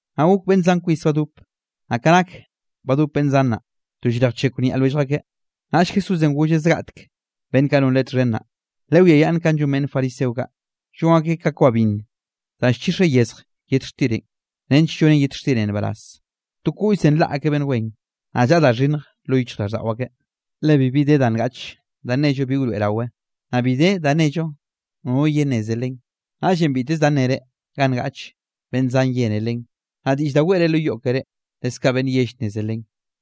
Naꞌ gok, beꞌnn zan kwis badop, naꞌ ka nak badop beꞌnn zan naꞌ, to llrejchekw niaꞌ lwellj akeꞌ, naꞌll Jesúsenꞌ golleꞌ zgaꞌtek beꞌnn kaꞌ non Leꞌe txhen naꞌ: —Lewiayaꞌnn kanꞌ llon beꞌnn fariseo kaꞌ, llon akeꞌ ka kwa binn danꞌ llchixeꞌ yezj yet xtirenꞌ, nench llonen yet xtirenꞌ nbaraz. To koꞌllzen nlaꞌ akeꞌ beꞌnn wen, naꞌ llaꞌa da xhinnj lo raꞌlldaꞌo akeꞌ. Le bibi de da ngaꞌche da nello bi wroeꞌrawe, naꞌ bi de da nello nono yenneze len. Naꞌllenꞌ biteze da nnere ga ngaꞌche, beꞌnn zan yene len, naꞌ diꞌll da weꞌre lo yoꞌ keré, leskaꞌ beꞌnn yell nneze len.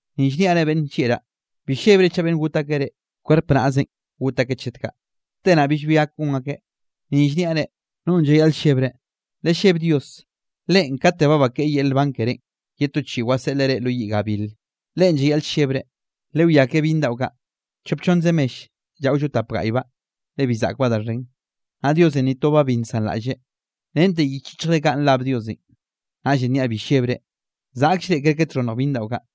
’Ni llniaꞌ reꞌ beꞌnn nllieꞌraꞌ, bi llebre chaꞌ beꞌnn got akeꞌ reꞌ, kwerp naꞌzenꞌ got akeꞌ chet kaꞌ, te naꞌ billbi gak gon akeꞌ. Ni llniaꞌ reꞌ, nonꞌ llayaꞌl llebre, lelleb Dios, Leꞌen kate ba bakeꞌe yel nban kerénꞌ, ye to chiꞌi waseꞌleꞌ reꞌ lo yiꞌ gabil, Leꞌen llayaꞌl llebre. ’Lewiake byinn daꞌo kaꞌ, chop chonnze mell llaꞌollo tap gaꞌybaꞌ, le bi zaꞌkbaꞌ da xhen. Naꞌ Diosenꞌ ni tobaꞌ bi nsanraꞌlleꞌ. Rente yich yichjre kaꞌ nrab Diosenꞌ. Naꞌllenꞌ niaꞌ bi llebre, zaꞌkll reꞌ kerke txhonnj byinn daꞌo kaꞌ.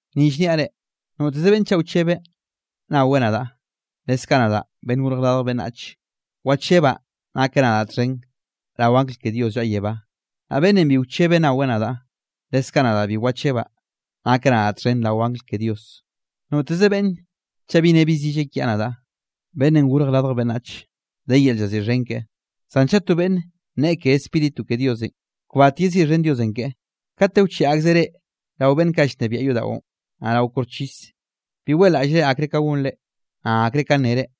’Ni llniaꞌ reꞌ, noteze beꞌnn chaꞌ wchebeꞌ nnaweꞌ nadaꞌ, leskaꞌ nadaꞌ, Beꞌnnenꞌ Gorj Radj Beꞌnnach, wachebaꞌ nakeꞌ nadaꞌ txhen rao angl ke Dios llaꞌa yebá. Naꞌ beꞌnnenꞌ bi wchebeꞌ nnaweꞌ nadaꞌ, leskaꞌ nadaꞌ bi wachebaꞌ nakeꞌ nadaꞌ txhen rao angl ke Dios. ’Noteze beꞌnne chaꞌ bi nne bi zille kiaꞌ nadaꞌ, Beꞌnnenꞌ Gorj Radj Beꞌnnach, de yel llaziꞌxhen keꞌe; zan chaꞌ to beꞌnn nne ke Spíritu ke Diosenꞌ, kbat yeziꞌxhen Diosenꞌ keꞌe. ’Kate wcheꞌe akzeꞌ reꞌ rao beꞌnn kaꞌ llnebiaꞌ yodaꞌon, naꞌ rao koxchis, bi weꞌlaꞌllre akre ka gonre, naꞌ akre ka nnere,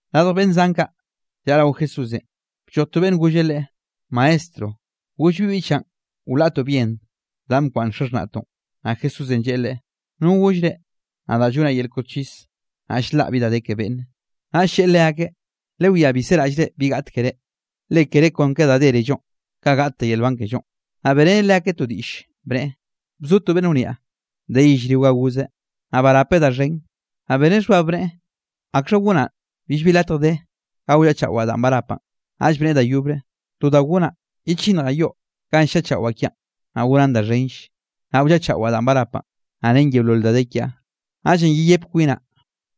Radj beꞌnn zan kaꞌ llaꞌa rao Jesúsenꞌ, blloj to beꞌnn golleꞌ Leꞌe: —Maestro, goll bi biꞌchaꞌn wlaꞌtoꞌ bien danꞌ bkwaꞌnn xaxhnaꞌtoꞌn. Naꞌ Jesúsenꞌ lleꞌe leꞌe: —¿No goll reꞌ, nadaꞌ llonaꞌ yel koxchis, naꞌ ll-laꞌ bi da de ke beꞌnne? Naꞌll lleꞌe leakeꞌ: —Lewiá bi seraꞌllre bi gaꞌt keré, le kere kon ka da dérellonꞌ, kaꞌ gaꞌtte yel nban kellonꞌ. Naꞌ beꞌreneꞌ leakeꞌ to diꞌll, bneꞌe: —Bzo to beꞌnn wniaꞌ, de yellrionꞌ ga gozeꞌ, naꞌ barapeꞌ da xhen. Naꞌ beneꞌ xhbab bneꞌe: “¿Akxha gonaꞌ? Billbi latj de ga wllaꞌchaꞌwaꞌ danꞌ barapaꞌn.” Naꞌll bneꞌe da yobre: “To da gonaꞌ, yechinnjaꞌ yoꞌ ganꞌ nllaꞌchaꞌwaꞌ kiaꞌn, naꞌ gonaꞌn da xhenll, naꞌ wllaꞌchaꞌwaꞌ danꞌ barapaꞌn, naꞌ ren yeolol da de kiaꞌ. Naꞌllenꞌ yeyep kwinaꞌ: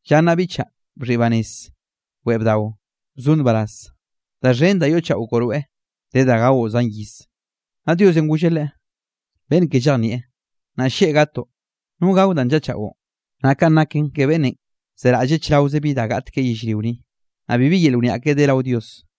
Lla nnaꞌ biꞌchaꞌ, bxhiꞌi banez, weꞌe bdao, bzo nbaraz, da xhen da yoꞌchaꞌo koꞌ rweꞌ de da gaoꞌ zan iz.” Naꞌ Diosenꞌ golleꞌ leꞌe: “Beꞌnn ke llejnieꞌ, nnaꞌ lleꞌ gatoꞌ, ¿no gao danꞌ nllaꞌchaꞌon?” Naꞌ kanꞌ naken ke beꞌnnenꞌ zeraꞌlleꞌ chraoze bi gaꞌt keꞌe yellrio ni, naꞌ bibi yel wniaꞌ keꞌe de rao Dios.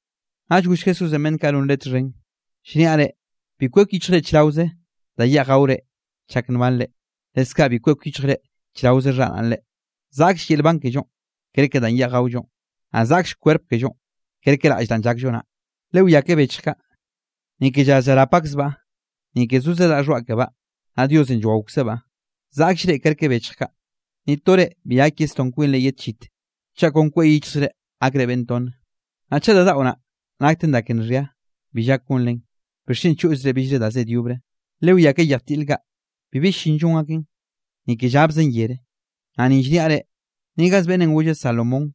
Naꞌll goll Jesúsenꞌ beꞌnn kaꞌ non Leꞌe txhen: —Llniaꞌ reꞌ, bi kwek yichjre chraoze da yeꞌj gaore chak nbanrenꞌ, leskaꞌ bi kwek yichjre chraoze xharaꞌnre. Zaꞌkll yel nban kellonꞌ kerke danꞌ yeꞌj gaollonꞌ, naꞌ zaꞌkll kwerp kellonꞌ kerke raꞌll danꞌ llakllo naꞌ. Lewiake bechj kaꞌ, ni ke llaz llarap akzbaꞌ, ni ke zoze daꞌ xhoaꞌ kebaꞌ, naꞌ Diosenꞌ llwaokzebaꞌ. Zaꞌkll reꞌ kerke bechj kaꞌ. Ni to reꞌ bi gak yesdón kwinre ye tchit, chaꞌ kon kwek yichjzre gakre beꞌnn tonne. Naꞌ chaꞌ da daꞌo naꞌ, nakten da ke nxhia bi llak gonre, ¿bixchen choꞌzre billre da zed yobre? ’Lewiake yej tiꞌl kaꞌ, bibi llin llon aken, ni ke llabzen yere, naꞌ ni llniaꞌ reꞌ, ni gaz beꞌnnenꞌ golle Salomón,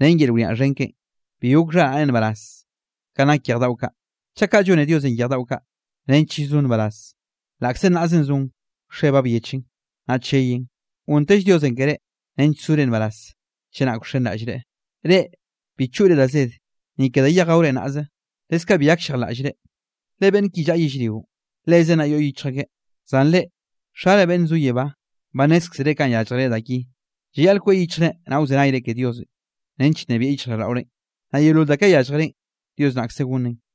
ren yel wniaꞌ xhen keꞌen, bi gok xharaꞌneꞌ nbaraz kanꞌ nak yej daꞌo kaꞌ. Chaꞌ kaꞌ llone Diosenꞌ yej daꞌo kaꞌ, nench llzon nbaraz, laꞌkze nnaꞌzenꞌ zon, wxe ba byechen, naꞌ cheyen, gontell Diosenꞌ ke reꞌ nench zore nbaraz chenak wxenraꞌllre. Reꞌ, bi choꞌre da zed, ni ke danꞌ yeꞌj gaore naꞌze, leskaꞌ bi gakllejlaꞌllre. Le beꞌnn ki llaꞌa yellrionꞌ, lezen naꞌ yoꞌ yichj akeꞌ, zan reꞌ, Xare beꞌnn zo yebá, ba nnézkzereꞌ kanꞌ yálljere da ki. Llayaꞌl kweꞌ yichjre naꞌ wzenayre ke Diosenꞌ, nench nnebieꞌ yichjraꞌlldaꞌorenꞌ, naꞌ yeolol da kaꞌ yálljerenꞌ, Dios naꞌkze gonneꞌn.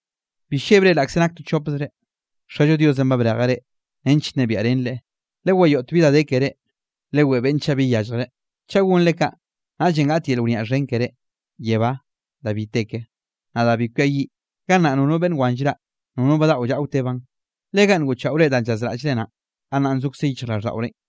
’Bi llebre laꞌkze nak to chopzre, Xallo Diosenꞌ ba brejeꞌ reꞌ, nench nnebiaꞌ renre Leꞌe. Lewayoꞌte bi da de kere, leweꞌe beꞌnn chaꞌ bi yalljreꞌ, chaꞌ gonre kaꞌ, naꞌllenꞌ gaꞌt yel wniaꞌ xhen keré yebá da bi te ke, naꞌ da bi kwiayiꞌ. Gannaꞌ nono beꞌnn wan llraꞌ, nono badaꞌo llaꞌa wtebaꞌn. Le ganꞌ ngoꞌchaꞌore danꞌ llazraꞌllre naꞌn, gannaꞌn zokze yichjraꞌlldaꞌorenꞌ.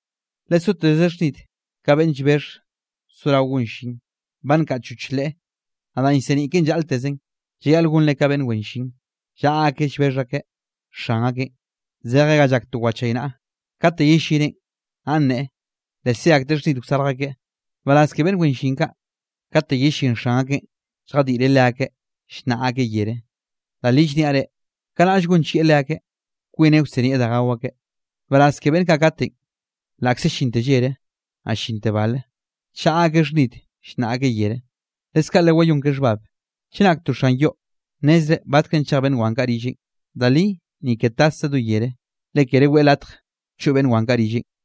’Lesoteze xhnid ka beꞌnn llbexh sorao gon llin, ba nkaꞌchoch leꞌe, naꞌ danꞌ llseniꞌ keꞌen llaꞌltezen. Llayaꞌl gonre ka beꞌnn wen llin, llaꞌa akeꞌ llbexh akeꞌ xan akeꞌn, zejeꞌ ga llak to wchaynaꞌa. Kate yellineꞌn, naꞌ nneꞌe, le ze akteꞌ xhnid wsarj akeꞌ. Nbaraz ke beꞌnn wen llin kaꞌ, katenꞌ yellín xan akeꞌn, lljadiꞌreꞌ leakeꞌ llnnaꞌ akeꞌ yere; da li llniaꞌ reꞌ, kanaꞌll gonchieꞌ leakeꞌ, kwineꞌ wsinieꞌ da gao akeꞌ. Nbaraz ke beꞌnn kaꞌ katenꞌ, laꞌkze llinte llere, naꞌ llinte bale, chaꞌa akeꞌ xhnid, llnnaꞌ akeꞌ yere. Leskaꞌ, lewayón ke xhbab, chenak to xan yoꞌ, nnezreꞌ batkrenꞌ chej beꞌnn wan kaꞌ rilleꞌn, da li, ni ke taszeꞌ do yere, le kere weꞌe latj choꞌ beꞌnn wan kaꞌ rilleꞌn.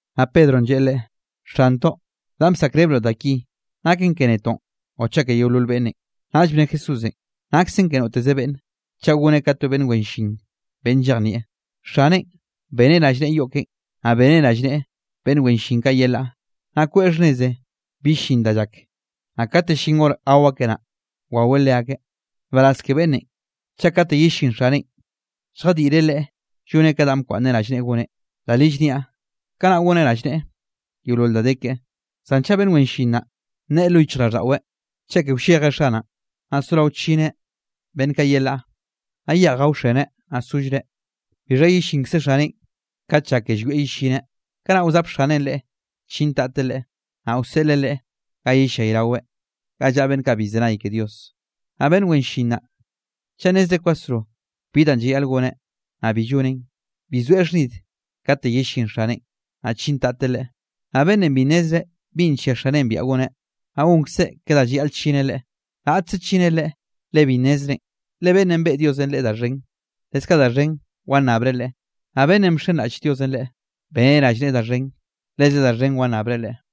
Naꞌ Pedronꞌ lleꞌe Leꞌe: —Xantoꞌ, ¿danꞌ llsaꞌkrebroꞌ da ki naken ke netoꞌn o chaꞌ ke yeolol beꞌnnenꞌ? Naꞌll bne Jesúsenꞌ: —Naksen ke noteze beꞌnne, chaꞌ goneꞌ ka to beꞌnn wen llin beꞌnn llejnieꞌ; xaneꞌn, beneꞌ rallneꞌe yoꞌ keꞌen, naꞌ beneꞌ rallneꞌe beꞌnn wen llin kaꞌ yelaꞌ, naꞌ kweꞌe xhnneze bi llin da llak, naꞌ kate llin hor gao akeꞌ naꞌ, waweꞌ leakeꞌ. Nbaraz ke beꞌnnenꞌ, chaꞌ kate yellín xaneꞌn, lljadiꞌreꞌ leꞌe lloneꞌ ka danꞌ bkwaꞌnneꞌ rallneꞌe goneꞌ. Da li llniaꞌ, kanaꞌ goneꞌ rallneꞌe yeolol da de keꞌe. Zan chaꞌ beꞌnn wen llin naꞌ, nneꞌe lo yichjraꞌlldaꞌweꞌ: “Cheke wlleje xanaꞌn”, naꞌ sorao chineꞌ beꞌnn kaꞌ yelaꞌ, naꞌ yeꞌj gaoxeneꞌ, naꞌ sollreꞌ. Bixha yellinkze xaneꞌ kat lla ke llwieꞌ yellineꞌ, kanaꞌ wzap xaneꞌn leꞌe, chintateꞌ leꞌe, naꞌ wseꞌleꞌ leꞌe ga yellayraweꞌ ga llaꞌa beꞌnn kaꞌ bi llzenay ke Dios. ’Naꞌ beꞌnn wen llin naꞌ, chaꞌ nnezreꞌ kwasro bi danꞌ llayaꞌl goneꞌ, naꞌ bi lloneꞌn, bi soeꞌ xhnid kate yellín xaneꞌn, naꞌ chintateꞌ leꞌe. Naꞌ beꞌnnenꞌ bi nnezreꞌ binꞌ nllia xaneꞌn biaꞌa goneꞌ, naꞌ gonkzeꞌ ke da llayaꞌl chineꞌ leꞌe, raꞌtze chineꞌ leꞌe, le bi nnezreꞌn. Le beꞌnnenꞌ beꞌe Diosenꞌ leꞌe da xhen, leskaꞌ da xhen wannabreꞌ leꞌe, naꞌ beꞌnnenꞌ bxenraꞌll Diosenꞌ leꞌe, beneꞌ rallneꞌe da xhen, leze da xhenll wannabreꞌ leꞌe.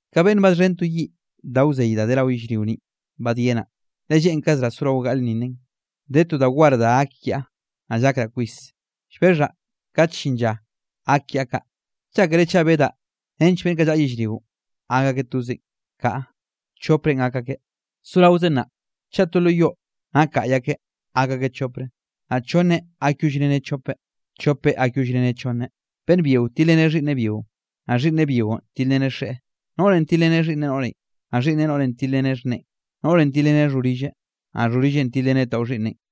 ’Ka beꞌnn badxhen to yiꞌ da wzey da de rao yellrio ninꞌ badyenaꞌ, le lleꞌnkazraꞌ sorao gaꞌlnninnen. De to da war da gak kiaꞌ, naꞌ llakraꞌ kwis, llbexhaꞌ kate llin lla gak kiaꞌ kaꞌ. ¿Llákere chaꞌ bedaꞌ nench beꞌnn kaꞌ llaꞌa yellrionꞌ gak akeꞌ tozeꞌn? Kaꞌa, choprenꞌ gak akeꞌ. Soraozen nnaꞌ, chaꞌ to lo yoꞌ nak gaꞌy akeꞌ, gak akeꞌ chopre, naꞌ chonneꞌ gakyollrene chopeꞌ, chopeꞌ gakyollrene chonneꞌ. Beꞌnn byionꞌ tilreneꞌ xhiꞌnneꞌ byionꞌ, naꞌ xhiꞌnneꞌ byionꞌ tilreneꞌ xeꞌen; noꞌrenꞌ tilreneꞌ xhiꞌnneꞌ noꞌrenꞌ, naꞌ xhiꞌnneꞌ noꞌrenꞌ tilreneꞌ xhneꞌen; noꞌrenꞌ tilreneꞌ xhorilleꞌ, naꞌ xhorilleꞌn tilreneꞌ tawxhiꞌnneꞌn.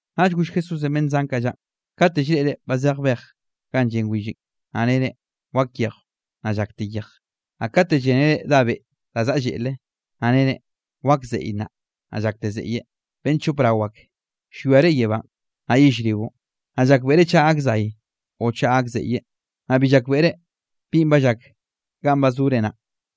Naꞌll goll Jesúsenꞌ beꞌnn zan kaꞌ llaꞌn: —Kate llreꞌre ba ze bej ganꞌ llen willenꞌ, naꞌ nere: “Wak yejw.” Naꞌ llakte yej. Naꞌ kate llénere dá beꞌ da zaꞌa lleꞌle, naꞌ nere: “Wak zeꞌye nnaꞌ.” Naꞌ llakte zeꞌye. ¡Beꞌnn chop rao ak! Llwiare yebánꞌ, naꞌ yellrionꞌ, naꞌ llakbeꞌre chaꞌ gak zay o chaꞌ gak zeꞌye, naꞌ bi llakbeꞌre binꞌ ba llak ganꞌ ba zore nnaꞌ.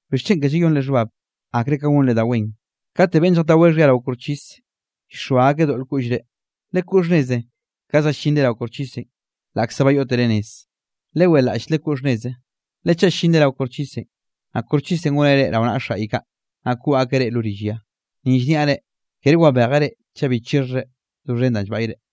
’¿Bixchen ke llayonre xhbab, akre ka gonre da wen? Kate beꞌnn lljataweꞌ xhia rao koxchis, llxoa akeꞌ doꞌl koꞌllre, lekoꞌ xhnneze ka za llinre rao koxchisenꞌ, laꞌkze ba yoꞌtere nez, leweꞌlaꞌll lekoꞌ xhnneze, le chaꞌ llinre rao koxchisenꞌ, naꞌ koxchisenꞌ goneꞌ reꞌ rao naꞌ xaꞌy kaꞌ, naꞌ koꞌ akeꞌ reꞌ lo rill ya. Ni llniaꞌ reꞌ, kere wabejeꞌ reꞌ chaꞌ bi chixhjre doxhen danꞌ llbaꞌyre.